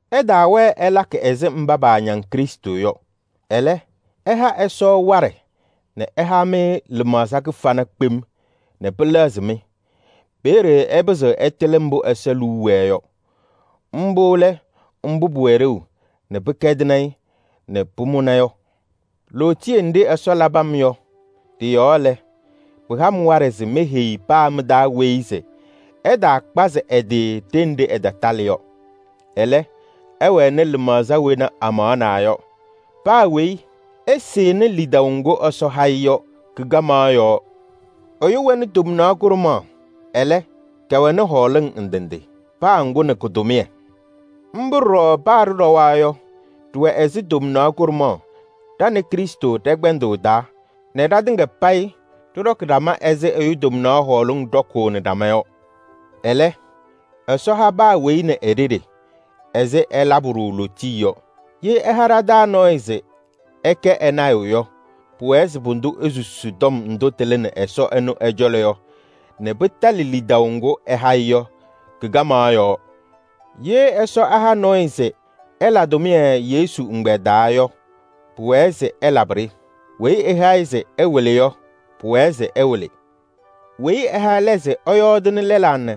Ɩtaawɛɛ ɩlakɩ ɛzɩ mba paañaŋ Krɩstʋ yɔ. Ɛlɛ, ɩha Ɛsɔ waɖɛ nɛ ɛha-mɩ lɩmaɣza kɩfana kpem nɛ pɩlɛɣzɩ-mɩ. Peeye ɩpɩzɩɣ ɩtɩlɩ mbʋ Ɛsɔ liu wɛɛ yɔ: mbʋ lɛ mbʋ pʋwɛ ɖeu nɛ pɩkɛdɩnɩ-ɩ nɛ pʋmʋna yɔ. Lootiye nɖɩ Ɛsɔ labɩ-m yɔ ɖɩ-yɔɔ lɛ, pɩha-m waɖɛ se meheyi paa mɩ-taa weyi se ɛtaakpazɩ ɛ-tɩ ɖenɖe ɛtatalɩ yɔ. Ɛlɛ, ɛwɛnɩ lɩmaɣza wena amaɣnaa yɔ. Paa weyi ɛsɩnɩ lidaʋ ŋgʋ Ɛsɔ ha-ɩ yɔ kɩ-kamaɣ yɔɔ. Ɛyʋ wɛnɩ tomnaɣ kʋɖʋmaɣ, ɛlɛ, kɛwɛnɩ hɔɔlɩŋ ndɩ ndɩ. Paa ŋgʋ nɛ kʋ-tʋmɩyɛ. Mbʋ ɖɔɖɔ paa ɖɩɖɔwa yɔ, ɖɩwɛ ɛzɩ tomnaɣ kʋɖʋmaɣ ɖa nɛ Krɩstʋ ɖɛ-kpɛndʋʋ taa nɛ ɖatɩŋa payɩ ɖɩɖɔkɩ ɖama ɛzɩ ɛyʋ tomnaɣ hɔɔlɩŋ ɖɔkʋʋnɩ ɖama yɔ. Ɛlɛ, Ɛsɔ ha paa weyi nɛ e-ɖeɖe ɛzɩ ɛlabɩ-ɖʋ lootiye yɔ. Ye ɛha ɖa-taa nɔɔyʋ se ɛkɛ ɛ-lɔɔyaɣ tʋ yɔ, pʋwɛɛ se pʋdʋ esusi tɔm ndʋ tɩlɩnɩ Ɛsɔ ɛnʋ ɛ-cɔlɔ yɔ nɛ pɩtalɩ lidaʋ ŋgʋ ɛha-ɩ yɔ kɩ-kamaɣ yɔɔ. Ye Ɛsɔ ɛha nɔɔyʋ se ɛla tʋmɩyɛ Yesu ɛgbɛyɛ taa yɔ, pʋwɛɛ se ɛlabɩ-ɖɩ. Weyi ɛha-ɩ se ɛwɩlɩ yɔ, pʋwɛɛ se ɛwɩlɩ. Weyi ɛha ɛlɛ se ɛyɔɔdɩnɩ lɛlaa nɛ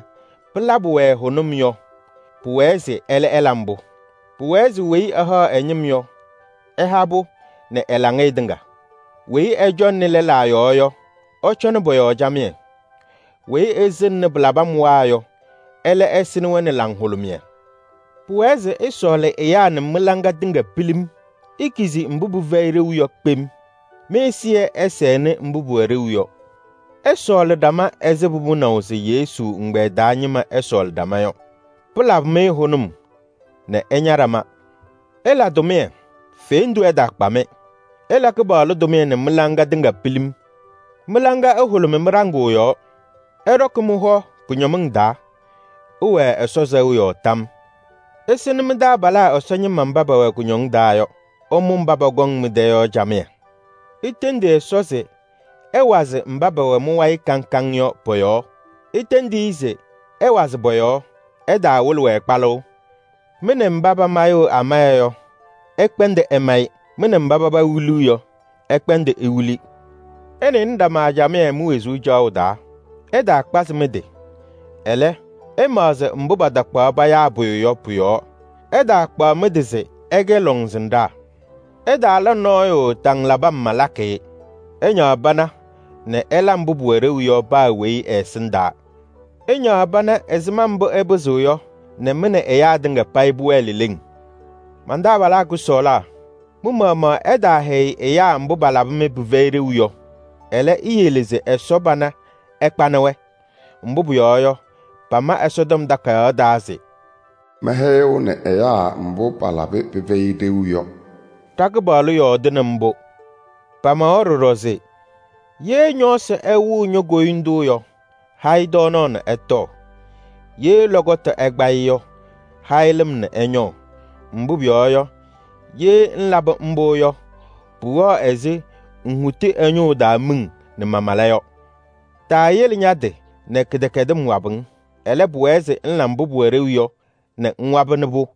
pɩlabɩ-wɛ hʋnʋm yɔ, pʋwɛɛ se ɛlɛ ɛla mbʋ. Pʋwɛɛ se weyi ɛhaɣ ɛ-ñɩm yɔ, ɛha-pʋ nɛ ɛ-laŋɩyɛ tɩŋa. Weyi ɛcɔŋnɩ lɛlaa yɔɔ yɔ, ɛcɔnɩ pɔ-yɔɔ camɩyɛ. Weyi ɛsɩŋnɩ pɩlabɩmwaa yɔ, ɛlɛ ɛsɩnɩ-wɛ nɛ laŋhʋlʋmɩyɛ. Pʋwɛɛ se ɩsɔɔlɩ ɛyaa nɛ mɩ-laŋɩyɛ tɩŋa pilim. Ikizi mbʋ pɩfɛyɩ ɖeu yɔ kpem. Mɩ-ɛzɩyɛ ɛsɛnɩ mbʋ pʋwɛ ɖeu yɔ. Ɩsɔɔlɩ ɖama ɛzɩ pʋmʋnaʋ se Yesu ɛgbɛyɛ taa ñɩma ɛsɔɔlɩ ɖama yɔ. Pɩlabɩ-mɩ hʋnʋm nɛ ɩña ɖama. Ɩla tʋmɩyɛ, fendu ɛtaakpa-mɩ. Ɩla Kɩpaɣlʋ tʋmɩyɛ nɛ mɩ-laŋa tɩŋa pilim. Mɩ-laŋa ɛhʋlʋmɩ mɩ-ɖaŋʋʋ yɔɔ. Ɩɖɔkɩ mɩ-hɔ kʋñɔmɩŋ taa. Ɩwɛɛ Ɛsɔ sɛʋ yɔɔ tam. Ɩsɩnɩ mɩ-taabalaa Ɛsɔ ñɩma mba pɛwɛ kɩcɛyɩm taa yɔ. Ɩmʋ mba pɔkɔŋ mɩ-tɛ yɔ camɩyɛ. Itendi Ɛsɔ se ɛwazɩ mba pɛwɛ mɩ-wayɩ kaŋ kaŋ yɔ pɔ-yɔɔ. Itendi-i se ɛwazɩ pɔ-yɔɔ, ɩtaawɩlɩ-wɛ kpalʋʋ. Mɩ nɛ mba pamayɩɣ amaya yɔ, ɩkpɛndɩ ɩmayɩ. Mɩ nɛ mba paba wiliɣ yɔ, ɩkpɛndɩ iwili. Ɩnɩnɩ ɖama camɩyɛ mi-wezuu caɣʋ taa. Ɩtaakpazɩ mɩ-tɩ, ɛlɛ, ɩmaɣzɩ mbʋ patakpaɣ payaa pʋyʋ yɔ pʋ-yɔɔ. Ɩtaakpaɣ mɩ-tɩ se ɩkɛ lɔŋsɩnɖaa. Ɩtaala nɔɔyʋ taŋ labɩ-m malakɩ-ɩ. Ɩñaɣ pana nɛ ɩla mbʋ pʋwɛ ɖeu yɔ paa weyi ɛ-ɛsɩndaa. Ɩñaɣ pana ɛzɩma mbʋ ɩpɩzɩɣ yɔ nɛ mɩ nɛ ɛyaa tɩŋa payɩ pʋwɛɛ leleŋ. Man-taabalaa kʋsɔɔlaa, mɩ-maɣmaɣ ɩtaahɛyɩ ɛyaa mbʋ palabɩ-mɩ pɩfɛyɩ ɖeu yɔ. Ɛlɛ, iyele se Ɛsɔ pana ɛkpanɩnɩ-wɛ. Mbʋ pʋyɔɔ yɔ, pama Ɛsɔtɔm Takayaɣ taa se: “Mɛhɛyɩɣnɩ ɛyaa mbʋ palabɩ pɩfɛyɩ ɖeu yɔ.” Ɖa-Kɩpaɣlʋ yɔɔdɩnɩ mbʋ. Pamawa ɖɔɖɔ se: “Ye ñɔɔsɩ ɛwɩɣ ño-koyindu yɔ, ha-ɩ tɔɔnaɣ nɛ ɛtɔɔ. Ye lɔkɔtʋ ɛkpa-ɩ yɔ, ha-ɩ lɩm nɛ ɛñɔɔ. Mbʋ pʋyɔɔ yɔ, ye ŋlabɩ mbʋ yɔ, pʋwɛɣ ɛzɩ ŋhuti ɛ-ñʋʋ taa miŋ nɛ mamala yɔ.” Taayele ña-tɩ nɛ kɩdɛkɛdɩm wabɩ-ŋ. Ɛlɛ, pʋwɛɛ se ŋla mbʋ pʋwɛ ɖeu yɔ nɛ ŋwabɩnɩ-pʋ.